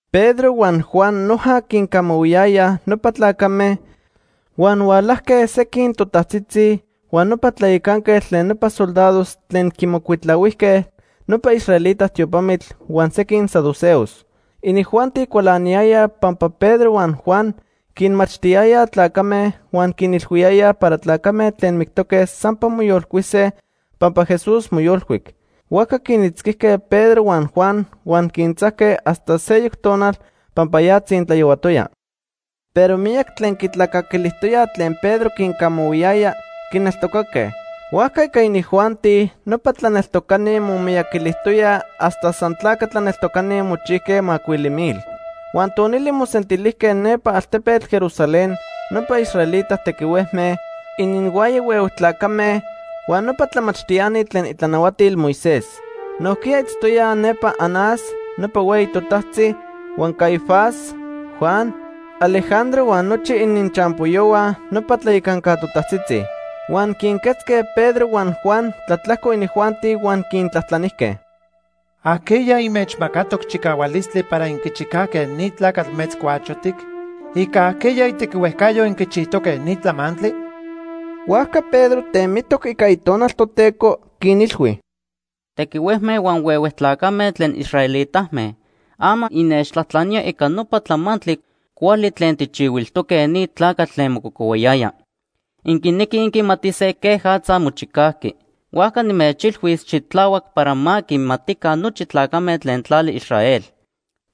Pedro huan Juan noja quincamahuiyayaj nopa tlacame, huan hualajque sequin totajtzitzi, huan nopa tlayacanquetl tlen nopa soldados tlen quimocuitlahuijque nopa israelita tiopamitl huan sequin saduceos. Inijuanti cualaniyayaj pampa Pedro huan Juan quinmachtiyayaj tlacame huan quinilhuiyayaj para tlacame tlen mictoque sampa moyolcuise pampa Jesús moyolcuic. Huajca quinitzquijque Pedro huan Juan huan quintzajque hasta seyoc tonal pampa ya tzintlayohuatoya. Pero miyac tlen quitlacaquilijtoyaj tlen Pedro quincamahuiyaya, quineltocaque. Huajca ica inijuanti, nopa tlaneltocani momiyaquilijtoyaj hasta san tlaca tlaneltocani mochijque macuili mil. Huan tonili mosentilijque nepa altepetl Jerusalén nopa israelita tequihuejme, ininhuaya huehue tlacame huan nopa tlamachtiani tlen itlanahuatil Moisés. Nojquiya itztoyaj nepa Anás, nopa hueyi totajtzi, huan Caifás, Juan, Alejandro huan nochi ininchampoyohua nopa tlayacanca totajtzitzi. Huan quinquetzque Pedro huan Juan tlatlajco inijuanti huan quintlajtlanijque: ―¿Ajqueya inmechmacatoc chicahualistli para inquichicajque ni tlacatl metzcuachotic? ¿Ica ajqueya itequihuejcayo inquichijtoque ni tlamantli? Huajca Pedro temitoc ica Itonal Toteco, quinilhui: ―Tequihuejme huan huehue tlacame tlen israelitame, ama innechtlajtlaníaj ica nopa tlamantli cuali tlen tijchihuilijtoque ni tlacatl tlen mococohuayaya. Inquinequij inquimatise quejatza mochicajqui. Huajca nimechilhuis xitlahuac para ma quimatica nochi tlacame tlen tlali Israel.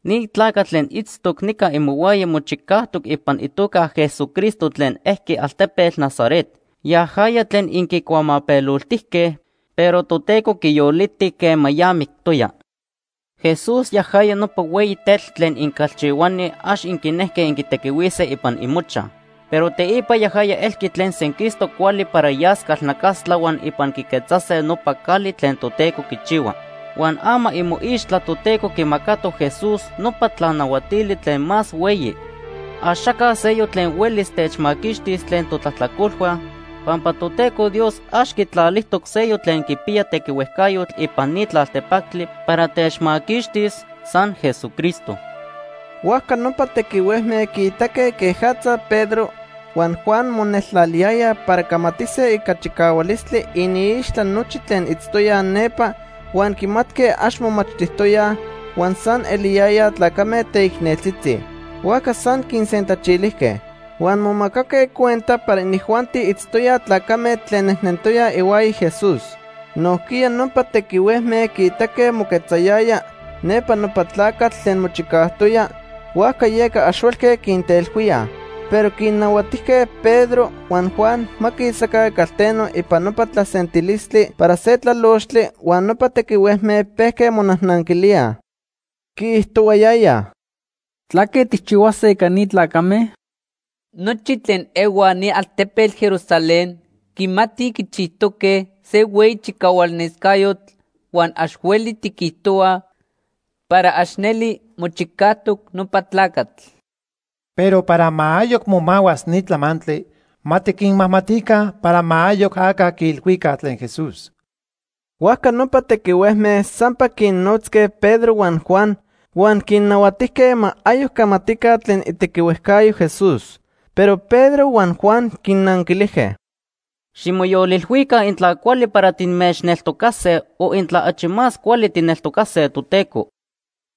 Ni tlacatl tlen itztoc nica imohuaya mochicajtoc ipan itoca Jesucristo tlen ejqui altepetl Nazaret. Yajaya tlen inquicuamapeloltijque, pero Toteco quiyoliti quema ya mictoya. Jesús yajaya nopa hueyi tetl tlen incalchihuani ax inquinejque inquitequihuise ipan imochaj. Pero teipa yajaya elqui tlen senquistoc cuali para yas calnacastla huan ipan quiquetzase nopa cali tlen Toteco quichihua. Huan ama imoixtla Toteco quimacatoc Jesús nopa tlanahuatili tlen más hueyi. Axaca seyoc tlen huelis techmaquixtis tlen totlajtlacolhua, pampa Toteco Dios ax quitlalijtoc seyoc tlen quipiya tequihuejcayotl ipan ni tlaltepactli para techmaquixtis, san Jesucristo. Huajca nopa tequihuejme quiitaque quejatza Pedro huan Juan moneltlaliyayaj para camatise ica chicahualistli iniixtla nochi tlen itztoyaj nepa huan quimatque ax momachtijtoyaj, huan san eliyayaj tlacame teicneltzitzi; huajca san quinsentlachilijque. Huan momacaque cuenta para inijuanti itztoyaj tlacame tlen nejnentoyaj ihuaya Jesús. Nojquiya nopa tequihuejme quiitaque moquetzayaya nepa nopa tlacatl tlen mochicajtoya, huajca yeca ax huelque quinteilhuíaj. Pero quinnahuatijque Pedro huan Juan ma quisaca calteno ipan nopa tlasentilistli para se tlalochtli huan nopa tequihuejme pejque monajnanquilíaj. Quiijtohuayayaj: ―¿Tlaque tijchihuase ica ni tlacame? Nochi tlen ehuaj ni altepetl Jerusalén quimatij quichijtoque se hueyi chicahualnescayotl huan ax hueli tiquijtohuaj para ax neli mochicajtoc nopa tlacatl. Pero para ma ayoc momahuas ni tlamantli, ma tiquinmajmatica para ma ayoc aca quiilhuica tlen Jesús. Huajca nopa tequihuejme sampa quinnotzque Pedro huan Juan huan quinnahuatijque ma ayoc camatica tlen itequihuejcayo Jesús. Pero Pedro huan Juan quinnanquilijque: ―Ximoyolilhuica intla cuali para timechneltocase o intla achi más cuali tijneltocase Toteco.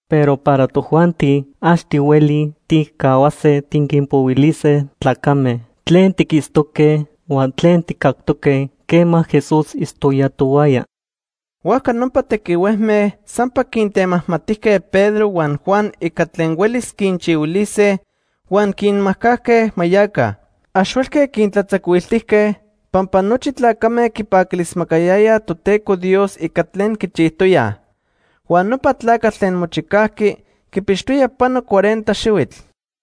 Pero para tojuanti ax tihuelij tijcahuase tiquinpohuilise tlacame tlen tiquitztoque huan tlen tijcactoque quema Jesús itztoya tohuaya. Huajca nopa tequihuejme sampa quintemajmatijque Pedro huan Juan ica tlen huelis quinchihuilise huan quinmajcajque ma yaca. Ax huelque quintlatzacuiltijque, pampa nochi tlacame quipaquilismacayayaj Toteco Dios ica tlen quichijtoyaj. Huan nopa tlacatl tlen mochicajqui quipixtoya pano cuarenta xihuitl.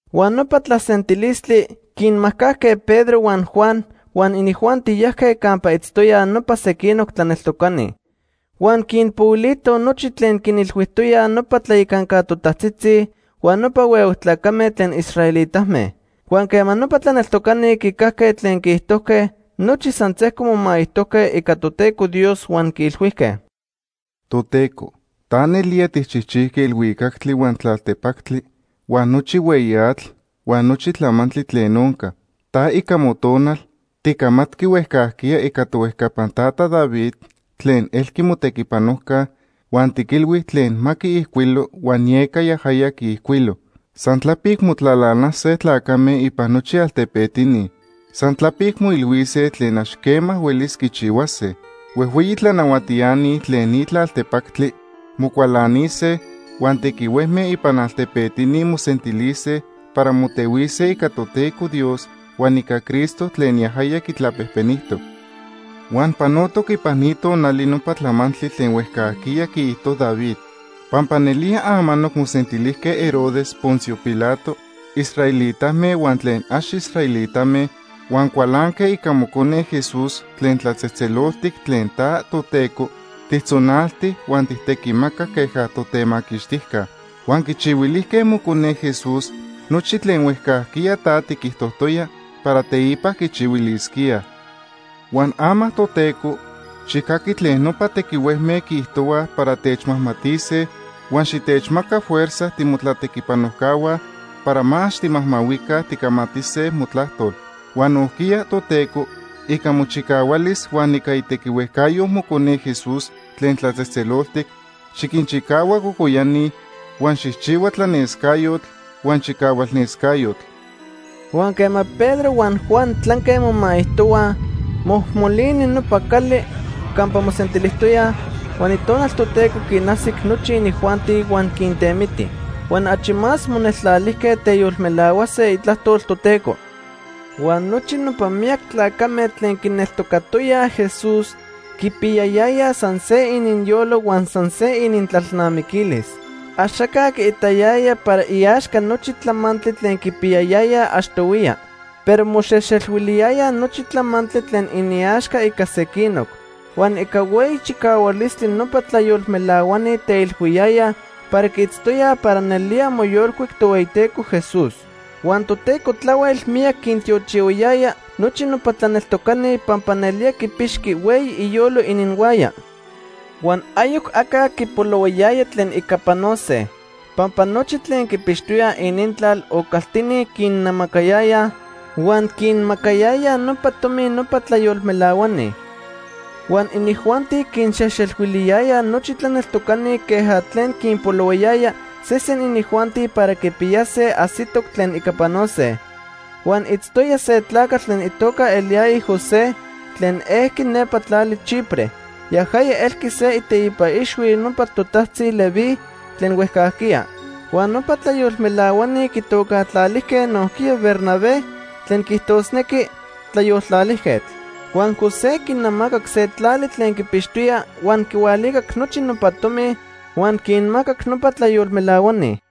Huan nopa tlasentilistli quinmajcajque Pedro huan Juan, huan inijuanti yajque campa itztoyaj nopa sequinoc tlaneltocani. Huan quinpohuilitoj nochi tlen quinilhuijtoyaj nopa tlayacanca totajtzitzi huan nopa huehue tlacame tlen israelitame. Huan quema nopa tlaneltocani quicajque tlen quiijtojque, nochi san sejco momaijtojque ica Toteco Dios huan quiilhuijque: “Toteco, ta nelía tijchijchijqui elhuicactli, huan tlaltepactli, huan nochi hueyi atl huan nochi tlamantli tlen onca. Ta, ica Motonal, ticamatqui huejcajquiya ica tohuejcapan tata David tlen elqui motequipanojca huan tiquilhui tlen ma quiijcuilo huan yeca yajaya quiijcuilo: ‘San tlapic motlalanase tlacame ipan nochi altepetini. San tlapic moilhuise tlen ax quema huelis quichihuase. Huejhueyi tlanahuatiani tlen ni tlaltepactli mocualanise, huan tequihuejme ipan altepetini mosentilise para motehuise ica Toteco Dios huan ica Cristo tlen yajaya quitlapejpenijtoc.’ “Huan panotoc ipan ni tonali nopa tlamantli tlen huejcajquiya quiijto David. Pampa nelía amanoc mosentilijque Herodes, Poncio Pilato, israelitame huan tlen ax israelitame huan cualanque ica mocone Jesús tlen tlatzejtzeloltic tlen ta, Toteco, tijtzonalti huan tijtequimacac queja totemaquixtijca. Huan quichihuilijque mocone Jesús nochi tlen huejcajquiya ta tiquijtojtoya para teipa quichihuilisquíaj. Huan ama, Toteco, xijcaqui tlen nopa tequihuejme quiijtohuaj para techmajmatise huan xitechmaca fuerza timotlatequipanojcahua para ma ax timajmahuica ticamatise motlajtol. Huan nojquiya, Toteco, ica mochicahualis huan ica itequihuejcayo mocone Jesús tlen tlatzejtzeloltic, xiquinchicahua cocoyani, huan xijchihua tlanescayotl huan chicahualnescayotl.” Huan quema Pedro huan Juan tlanque momaijtohuaj, mojmolini nopa cali campa mosentilijtoyaj. Huan Itonal Toteco quinajsic nochi inijuanti huan quintemiti. Huan achi más moneltlalijque teyolmelahuase itlajtol Toteco. Huan nochi nopa miyac tlacame tlen quineltocatoyaj Jesús quipiyayayaj san se ininyolo huan san se inintlalnamiquilis. Axaca quiitayaya para iaxca nochi tlamantli tlen quipiyayayaj achtohuiya. Pero moxejxelhuiliyayaj nochi tlamantli tlen iniaxca ica sequinoc. Huan ica hueyi chicahualistli nopa tlayolmelahuani teilhuiyayaj para quiitztoyaj para nelía moyolcuic Tohueyiteco Jesús. Huan Toteco tlahuel miyac quintiochihuayaya nochi nopa tlaneltocani pampa nelía quipixqui hueyi iyolo ininhuaya. Huan ayoc aca quipolohuayaya tlen ica panose. Pampa nochi tlen quipixtoyaj inintlal o caltini quinnamacayayaj, huan quinmacayayaj nopa tomi nopa tlayolmelahuani. Huan inijuanti quinxejxelhuiliyayaj nochi tlaneltocani queja tlen quinpolohuayaya sesen inijuanti para quipiyase ajsitoc tlen ica panose. Huan itztoya se tlacatl tlen itoca eliyaya José, tlen ejqui nepa tlali Chipre. Yajaya elqui se iteipa ixhui nopa totajtzi Leví tlen huejcajquiya. Huan nopa tlayolmelahuani quitocajtlalijque nojquiya Bernabé, tlen quiijtosnequi “tlayoltlalijquetl”. Huan José quinamacac se tlali tlen quipixtoya huan quihualicac nochi nopa tomi huan quinmacac nopa tlayolmelahuani.